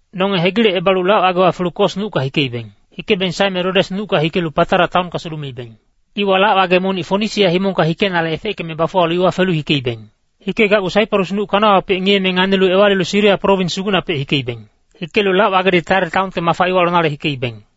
Nonge hegilecebalu lac-wagewa felu Kos nucka hikeibeng. Hikebeng saeme Rodes nucka hikelu Patara taonka sulumeibeng. Iwa lac-wage monic Fonisia himongka hikenale efeckeme bafuwalu iwa felu hikeibeng. Hikegacgu Saiparus nuc kanawapec ngiyeme nganilu ewalilu Siria prowins sugucnapec hikeibeng. Hikelu lac-wagedi Tair taonka mafa iwa lonale hikeibeng.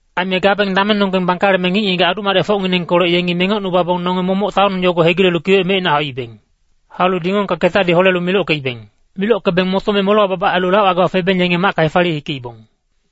Aime gabeng damengnonggeng bangkaleme ngic-ngigac adu-madecfocnginengkolec yengi mengocnubabong nonge momoc taon yogo hegilelu kiwec mecina hauibeng. Haulu dingongka ketadi holelu milockeibeng. Milockebeng motome molewa babac ailu lac-wagewa febeng yenge macka hefaliye hikeibong.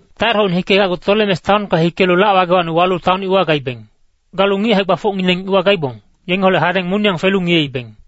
Tair-hocni hikegacgu Tolemes taonka hikelu lac-wagewacni walu taon iwa gaibeng. Galu ngic hae-gbafocngineng iwa gaibong, yengeholec hadeng moniyang felu ngiyeibeng.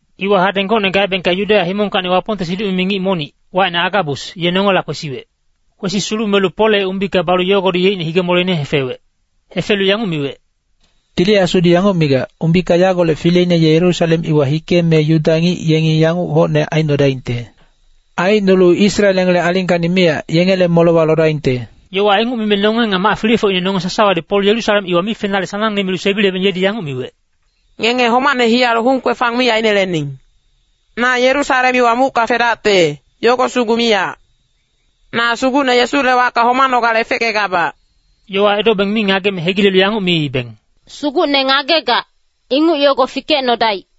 Iwa hadeng gocne gaebengka Yudeya himongkacni Wapongte siduc-mimi ngic monic, wacine Agabus, ye nongela kwesiwec. Kwesi sulumelu Polle umbika balu yogodi yeicne hige-moleine hefewec. Hefelu yanguc miwec, “Tili Asudi yanguc migac, ‘Umbika yagolec fileine ye Yerusalem iwa hikeme Yuda ngic yengi yanguc hocne aicnodaingte. Aicnolu Israel yengele alingkacni miyac, yengele molewa lodaingte.’” Yowa inguc mime nonge nga mac-filefocine nonge sasawadi Pol Yerusalem iwa mi fenale sanangne milu sebilebeng yedi yanguc miwec, “Ngenge homacne hiyalu hung-kwefang mi ainelening. Na Yerusalem iwa mucka fedacte, yogo sugu miyac. Na Sugucne Yesule wacka homanogale efeckegabac.” Yowa edobeng mi ngageme hegilelu yanguc miibeng, “Sugucne ngagegac, inguc yogo fikecnodaic.”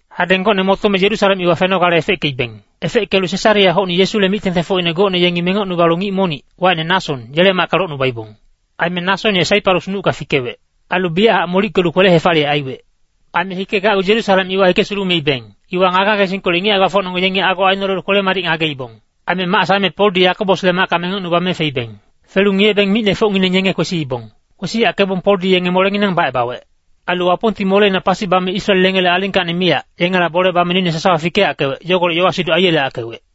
Hadeng gocne motome Yerusalem iwa fenogale efeckeibeng. Efeckelu Sesarea-hocni Yesule mic-tengtengfocine gocne yengi mengocnubalu ngic monic, wacine Nason, yele macka locnubaibong. Aime Nason ye Saiparus nucka fikewec. Ailu biyachac molickelu kwele-hefaliyec aiwec. Aime hikegacgu Yerusalem iwa hike sulumeibeng, iwa ngage-ngagesingkolec ngic hae-gbafocnonggeng yengi ago ainolelu kwele-madic ngageibong. Aime mac saeme Poldi Yakobosle macka mengocnubame feibeng. Felu ngiyebeng micnefocngineng yenge kwesiibong. Kwesiyackebong Poldi yenge molenginang bacebawec. Ailu Wapongti moleina pasi bame Israel yengele alingkacni miyac, yengela bole bame noine sasawa fikeyackewec, yogolec yowa-siduc aiyeleyackewec.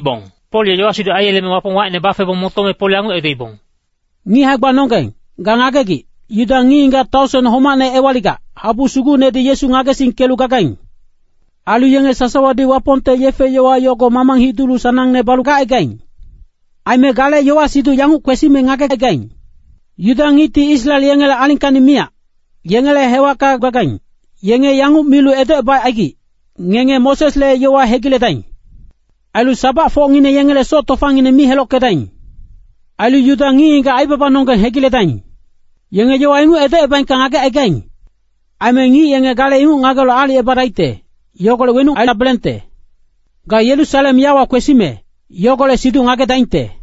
Pol ye yowa-siduc aiyeleme Wapong wacine bafebong motome Pol yanguc edoibong, “Ngic hae-gbanonggeng, ga ngagegic, Yuda ngic-ngigac taosen homacne ewaligac, habu sugucnedi Yesu ngagesingkelu gagaing. Ailu yenge sasawadi Wapongte yefe-yowa yogo mamang hidulu sanangne balu gacaigaing. Aime gale yowa-siduc yanguc kwesime ngagecaigaing. Yuda ngicti Israel yengele alingkacni miyac, yengele hewacka gagaing, yenge yanguc milu edocebacaigic, ‘Ngenge Mosesle yowa hegiledaing. Ailu sabacfocngineng yengele soc tofangineng mi helockedaing. Ailu Yuda ngic-ngigac aibabanonggeng hegiledaing.’ Yenge yowa inguc edocebaengka ngagecaigaing. Aime ngic yenge gale inguc ngagelu aalicebadaicte, yogolec wenuc aidabelengte. Ga Yerusalem yawa kwesimec, yogolec siduc ngagedaingte.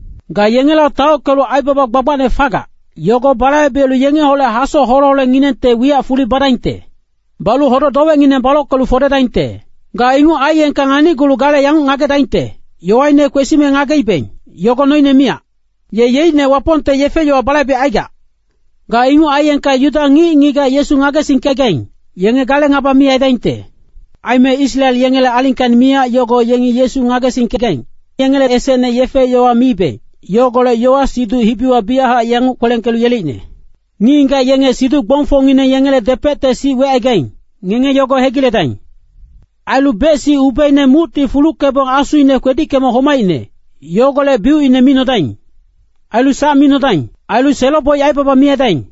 Ga yengela taockelu aibaba gbagbacne fagac, yogo balaibelu yengeholec hasoc hole-holenginengte wiyac fuli badaingte. Balu hodoc-dowecngineng balockelu fodedaingte. Ga inguc aiyengka nganicgulu gale yanguc ngagedaingte, ‘Yowaine kwesime ngageibeng, yogo noine miyac. Ye yeicne Wapongte yefe-yowa balaibecaigac.’ Ga inguc aiyengka Yuda ngic-ngigac Yesu ngagesingkegaing, yenge gale ngaba mi aidaingte. Aime Israel yengele alingkacni miyac yogo yengi Yesu ngagesingkegaing, yengele esecne yefe-yowa miibeng, yogolec yowa-siduc hibiwa biyachac yanguc kwelengkelu yeleicne. Ngic-ngigac yenge siduc-gbongfocngineng yengele depecte sic wecaigaing, ngenge yogo hegiledaing. Ailu bec-sic ubeina mucti fuluckebong asuine kwedickeme homaicne, yogolec biucine mi nodaing. Ailu sac mi nodaing. Ailu selo-boic aibaba mi aidaing.”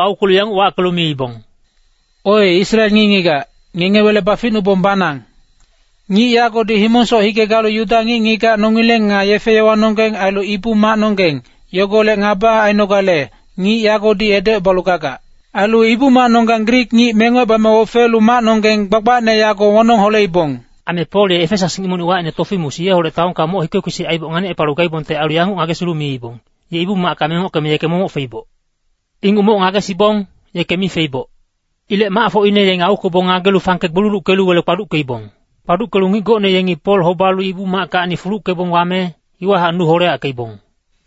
aukwelu yanguc wackelu miibong, “Oe Israel ngic-ngigac, ngenge wele baficnubabong banang! Ngic yagodi himongsoc hike galu Yuda ngic-ngigac nongileng nga yefe-yowanonggeng ailu Ibu-macnonggeng, yogolec ngaba ainogale, ngic yagodi edocebalu gagac. Ailu Ibu-macnonggang Grik ngic mengocebame ofelu macnonggeng gbagbacne yago wonong holeibong.” Aime Pol ye Efesas ngic monic wacine Tofimus yeholec taonka moc hike-kwesic aiboc nganicepalu gaibongte ailu yanguc ngagesilu miibong, “Ye Ibu-macka mengockeme yeke momoc feiboc.” Inguc moc ngagesiibong, yeke mi feiboc. Ilec macfocine yenge aukwebong ngagelu fangke gbululuckelu wele kpaduckeibong. Kpaduckelu ngic gocne yengi Pol hobalu Ibu-mackacni fuluckebong wame, iwahac nu holeyackeibong.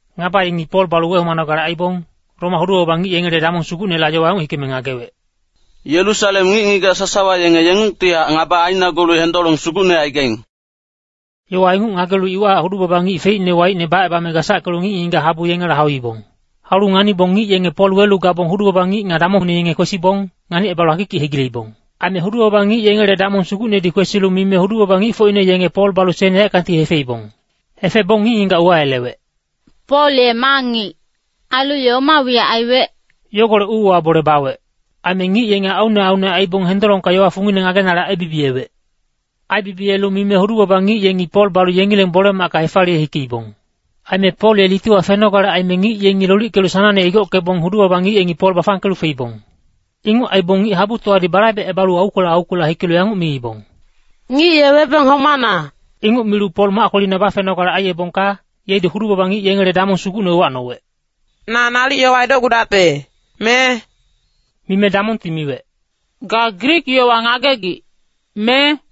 Ngaba yengi Pol balu wehomanogale aibong, Roma hudu-baba ngic yengele damong sugucnela yowa yanguc hikeme ngagewec, “Yerusalem ngic-ngigac sasawa yenge yengungtihac ngaba ainagulu hendolong sugucne aigaing.” Yowa inguc ngagelu iwahac hudu-baba ngic feicne waicne bacebame gasackelu ngic-ngigac habu yengela hauibong. Haulu nganibong ngic yenge Pol welu gabong hudu-baba ngic nga damongngineng yenge kwesibong, nganicebalu akikic hegileibong. Aime hudu-baba ngic yengele damong sugucnedi kwesilu mime hudu-baba ngicfocine yenge Pol balu sen yaeckangti hefeibong. Hefebong ngic-ngigac uwayelewec, “Pol ye ma ngic, ailu ye oma wiyac aiwec?” Yogolec uuwa bole bawec. Aime ngic yenge aunne aunne aibong hendolongka yowa fungine ngagenale aibibiyewec. Aibibiyelu mime hudu-baba ngic yengi Pol balu yengileng bole-macka hefaliye hikeibong. Aime Pol ye litiwa fenogale aime ngic yengi lolickelu sanangne igockebong hudu-baba ngic yengi Pol bafangkelu feibong. Inguc aibong ngic-habutowadi balaibecebalu aukwela aukwela hikelu yanguc miibong, “Ngic ye webeng homana!” Inguc milu Pol mac kwelina bafenogale aiyebongka, yedi hudu-baba ngic yengele damong sugucne uwacnowec, “Na nalic yowa edocgudacte, me?” Mime damongti miwec, “Ga Grik yowa ngagegic, me?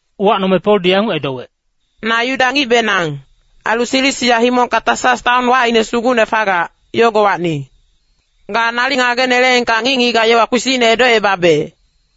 Uwacnome Poldi yanguc edowec, “Na Yuda ngicbenang, ailu Silisia himongka Tasas taon wacine sugucne fagac, yogowacni. Ga nalic ngageneleengka ngic-ngigac yowa kpisicne edocebabe.”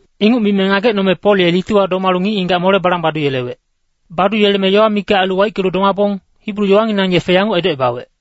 Inguc mime ngagecnome Pol ye litiwa domalu ngic-ngigac mole balang baduyelewec. Baduyeleme yowa mikac ailu waickelu domabong, Hibru yowanginang yefe yanguc edocebawec,